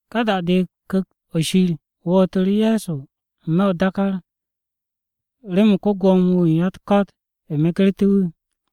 Ka da-de, Ku̱kt-o̱ Shir wootu̱ru̱ Ye̱so n-me̱ o-dákár remen ko-Gwo̱mo-wu̱ u̱n ya-u̱t-ko̱t megertú̱ wu̱.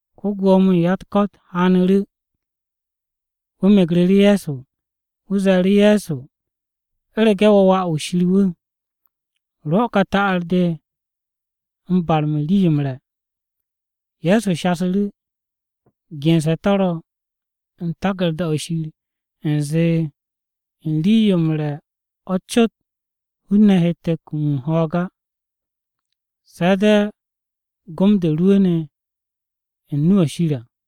Ko-Gwo̱mo-wu̱ u̱n ya-u̱t-ko̱t haanu̱ru̱, wu̱ megru̱ru̱ Ye̱so. Wu̱ ze̱e̱ru̱ Ye̱so, “U̱rege̱ wo̱ Wà-wu̱ Shir wu̱, rwo̱ ka ta'ar-to̱ barme̱ rii-yo m-re̱!” Ye̱so shasu̱ru̱, “Gense̱ to̱ ro̱ u̱n taku̱rda-o̱ Shir u̱nze, “ ‘U̱n rii-yo m-re̱ o̱ cot hun-ne̱ hette̱ kum m-ho̱o̱g á, se̱ de̱ gom-to̱ rwu̱u̱ne̱ u̱n nu-o Shir à kap.’”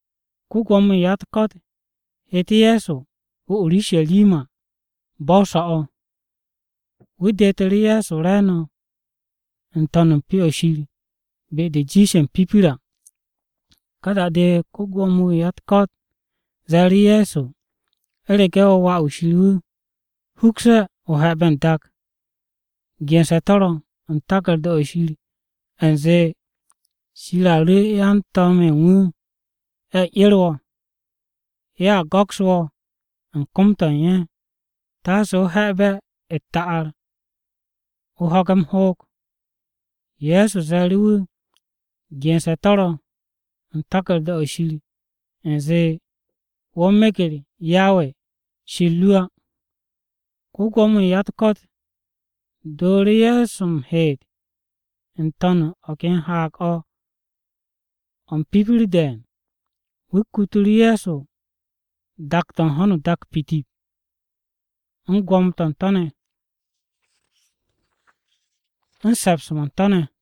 Ko-Gwo̱mo-wu̱ u̱n ya-u̱t-ko̱t heete̱ Ye̱so o-Urusharima bo̱-o̱ so̱-o̱. Wu̱ detu̱ru̱ Ye̱so re̱e̱no̱ n-to̱n u̱n Pyo-o̱ Shir be-de jiishe̱ m-pipir à. Ka da-de ko-Gwo̱mo-wu̱ u̱n ya-u̱t-ko̱t ze̱e̱ru̱ Ye̱so, “U̱rege̱ wo̱ Wà-wu̱ Shir wu̱, hukse̱, o he̱be̱ n-dak. Gense̱ to̱ ro̱ u̱n taku̱rda-o̱ Shir, u̱nze, “ ‘Shir a ru̱ yan-to̱m-ye̱ u̱n wu̱ ye̱ 'er wo̱. Ye̱a go̱ks wo̱ u̱n kom-to̱ u̱n ye̱, taase o he̱be̱ u̱t-ta'ar o ho̱ge̱ m-hoog.’” Ye̱so ze̱e̱ru̱ wu̱, “Gense̱ to̱ ro̱ u̱n taku̱rda-o̱ Shir, u̱nze, ‘Wo̱ meger Yawe Shir ru á!’” Ko-Gwo̱mo-wu̱ u̱n ya-u̱t-ko̱t dooru̱ Ye̱so m-heet n-to̱n u̱n o̱ ken haag-o̱, o̱ m-pipir de̱e̱n. Wu̱ kutu̱ru̱ Ye̱so dak-to̱ u̱n ho̱no o-dak pitip u̱n gwo̱mo-to̱ u̱n to̱ ne̱, u̱n se̱ps-mo̱ u̱n to̱ ne̱.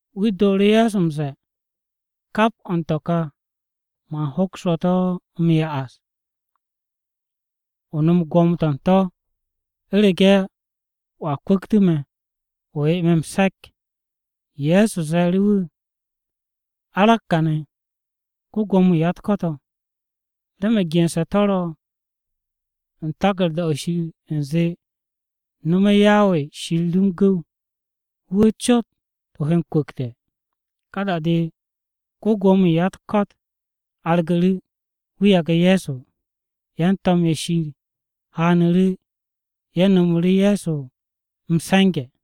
Wu̱ dooru̱ Ye̱so m-ze̱e̱, “Kap o̱ u̱n to̱ ka man hoks wo̱ to̱ m-ya'as, o nom gwo̱mo-to̱ u̱n to̱, u̱rege̱ wo̱a kwu̱ktu̱tu̱ me̱ o 'ye me̱, m-se̱k.” Ye̱so ze̱e̱ru̱ wu̱, “Arag kàne̱ ko-Gwo̱mo-wu̱ u̱n ya-u̱t-ko̱t o̱! Remen gense̱ to̱ ro̱ u̱n taku̱rda-o̱ Shir u̱nze, “ ‘Nome̱ Yawe Shir ru m-gu̱w, wu̱ wu̱ cot o he m-kwu̱kte̱.’” Ka da-de, ko-Gwo̱mo-wu̱ u̱n ya-u̱t-ko̱t argu̱ru̱, wu̱ yage̱ Ye̱so. Yan-to̱m-ye̱ Shir haanu̱ru̱ ye̱ nomoru̱ Ye̱so m-se̱nge̱.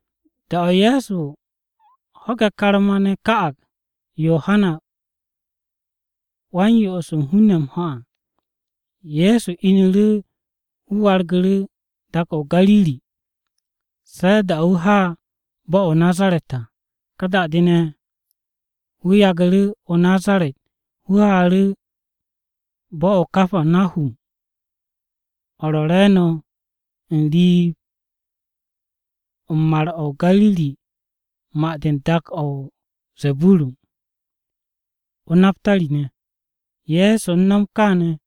Da-o̱ Ye̱so ho̱ge̱ karma-ne̱ ka'ag Yohana Wa-m-Yo'os u̱n hun-ne̱ m-ho̱ à, Ye̱so inu̱ru̱ wu̱ wargu̱ru̱ dak-o̱ o-Gariri. Se̱ da-o̱ wu̱ ha bo̱-o̱ o-Nazaret à, ka da-de ne̱, wu̱ yagu̱ru̱ o-Nazaret wu̱ haaru̱ bo̱-o̱ o-Kapanahum o̱ ro̱ re̱e̱no̱ n-riib o̱ u̱n mar-o̱ Gariri ma-de u̱n dak-o̱ o-Zeburun, o-Napari ne̱. Ye̱so u̱n no̱m kaane̱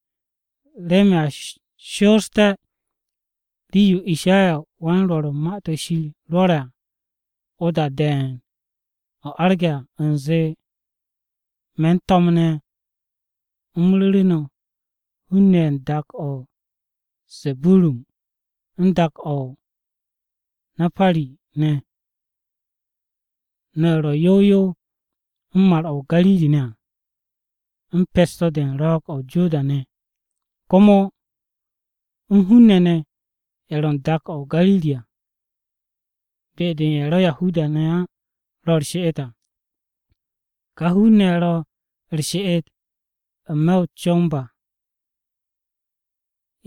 remen a shoosté̱ rii-yo Ishayawan-Rwo̱r rwo̱re̱ à, o-da de̱e̱n o̱ arge̱ à u̱nze, “Me̱n to̱m ne̱ u̱m ru̱ru̱ no̱ hun-ne̱ ye̱ u̱n dak-o̱ o-Zeburun u̱n dak-o̱ o-Napari ne̱. No̱ ye̱ ro̱ yow yow u̱n mar-o̱ Gariri ne̱ à, u̱n pes-to̱ u̱n Ro̱o̱g-o̱ o-Joda ne̱, komo u̱n hun-ne̱ ne̱ ye̱ ro̱ u̱n dak-o̱ o-Gariri à, be-de ye̱ ro̱ Yahuda-ne̱ á ro̱ u̱r-she'et à. Ka hun-ne̱ ye̱ ro̱ u̱r-she'et n-me̱ o-comb à,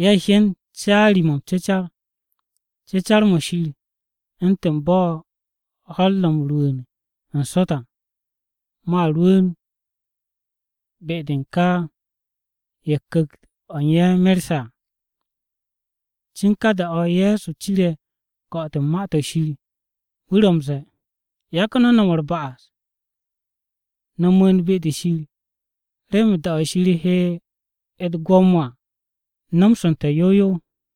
ye̱ hyen caari-mo̱ m-cecar. Cecar-mo̱ Shir, u̱ntu̱n bo̱ ho̱-u̱r ro̱ m-rwu̱u̱n n-sot à, Mo̱a rwu̱u̱n be-de u̱n ka ye̱ ku̱kt-to̱ u̱n ye̱ merse̱ à.” Cin ka da-o̱ Ye̱so cire̱ ko̱'o̱t-o̱ Ma-to̱ Shir, wu̱ ro̱ m-ze̱e̱, “Yagu̱ no̱ no̱m u̱r-ba'as, no̱ mu̱u̱n be-de Shir, remen da-o̱ Shir he u̱t-gwo̱mo à nomsu̱nte̱ yow yow.”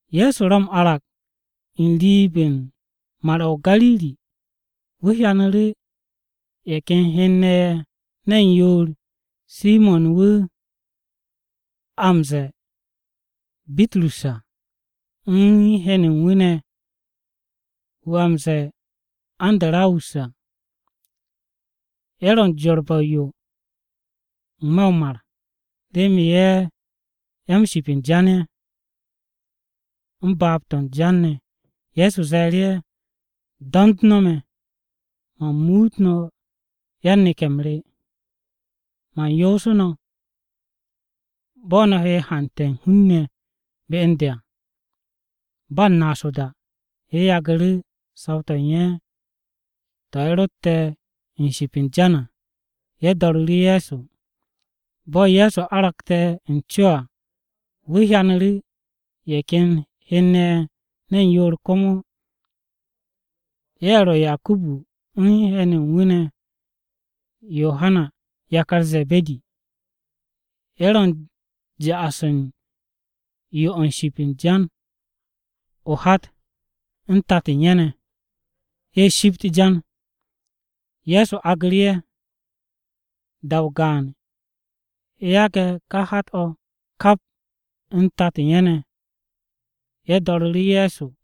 Ye̱so ro̱ m-arag n-riib o̱ u̱n Mar-o̱ o-Gariri. Wu̱ hyanu̱ru̱ ye̱ ken hen-ne̱ ye̱ ne̱n yoor, Simo̱n wu̱ a m-ze̱e̱ Bitrus à, u̱n hen u̱n wu̱ ne̱ wu̱ a m-ze̱e̱ Andarawus à. Ye̱ ro̱ m-jorbe̱ o-yo n-me̱ o-mar, remen ye̱ ya-m-ship u̱n jan-ye̱, u̱n baab-to̱ u̱n jan ne̱. Ye̱so ze̱e̱ru̱ ye̱, “Do̱nd no̱ me̱, man muut no̱ yan-neke̱-m re. Man yoosu̱ no̱ bo̱ no̱ he haante̱ u̱n hun-ne̱ be u̱n de à.” Ba u̱n naas o-da, ye̱ yagu̱ru̱ saw-to̱ u̱n ye̱ to̱ ye̱ rotte̱ u̱n ship u̱n jan à, ye̱ do̱ru̱ru̱ Ye̱so. Bo̱ Ye̱so aragte̱ u̱n co à, wu̱ hyanu̱ru̱ ye̱ ken hen-ne̱ ye̱ ne̱n yoor komo. Ye̱ ro̱ Yakubu u̱n hen u̱n wu̱ ne̱ Yohana yakar Ze̱be̱di. Ye̱ ro̱ u̱n ja'as u̱n yo-o̱ u̱n ship u̱n jan o-hat u̱n tato-o̱ u̱n ye̱ ne̱, ye̱ shipt jan. Ye̱so aagu̱ru̱ ye̱. Da-o gaan, ye̱ yage̱ o-hat kap u̱n tato u̱n ye̱ ne̱, ye̱ do̱ru̱ru̱ Ye̱so.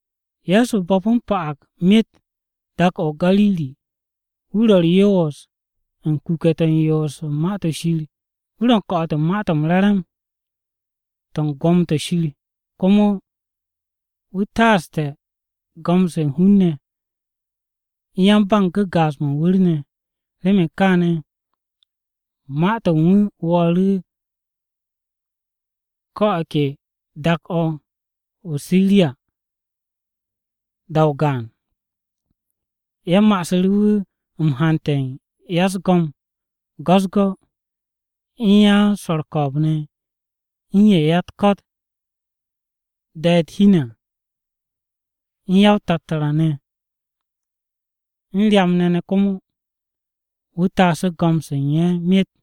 Ye̱so bo̱pu̱ m-pa'ag myet dak-o̱ o-Gariri, wu̱ ro̱ u̱r-yoos u̱n kuke̱-to̱ u̱n yoos u̱n Ma-to̱ Shir. Wu̱ ro̱ m-ko̱'o̱t Ma-to̱ m-Re̱re̱m to̱ u̱n gwo̱mo-to̱ Shir. Komo wu̱ taaste̱ go̱m-se u̱n hun-ne̱ u̱n ya-ba-m-gu̱gaaz mo̱ o-wu̱r ne̱. Remen kaane̱, ma-to̱ u̱n wu̱ wo̱o̱ru̱ ko̱ o̱ ke dak-o̱ o-Siriya da-o gaan. Ye̱ ma'asu̱ru̱ wu̱ m-hante̱ u̱n ya-u̱s-go̱m go̱-u̱s-go̱, u̱n yan-swo̱ u̱r-ko̱o̱b ne̱, u̱n ye̱ ya-u̱t-ko̱t da'e̱ u̱t-hi ne̱ à u̱n ya-o-tattara ne̱, u̱n ryam-ne̱ komo. Wu̱ taasu̱ go̱m-se u̱n ye̱ myet.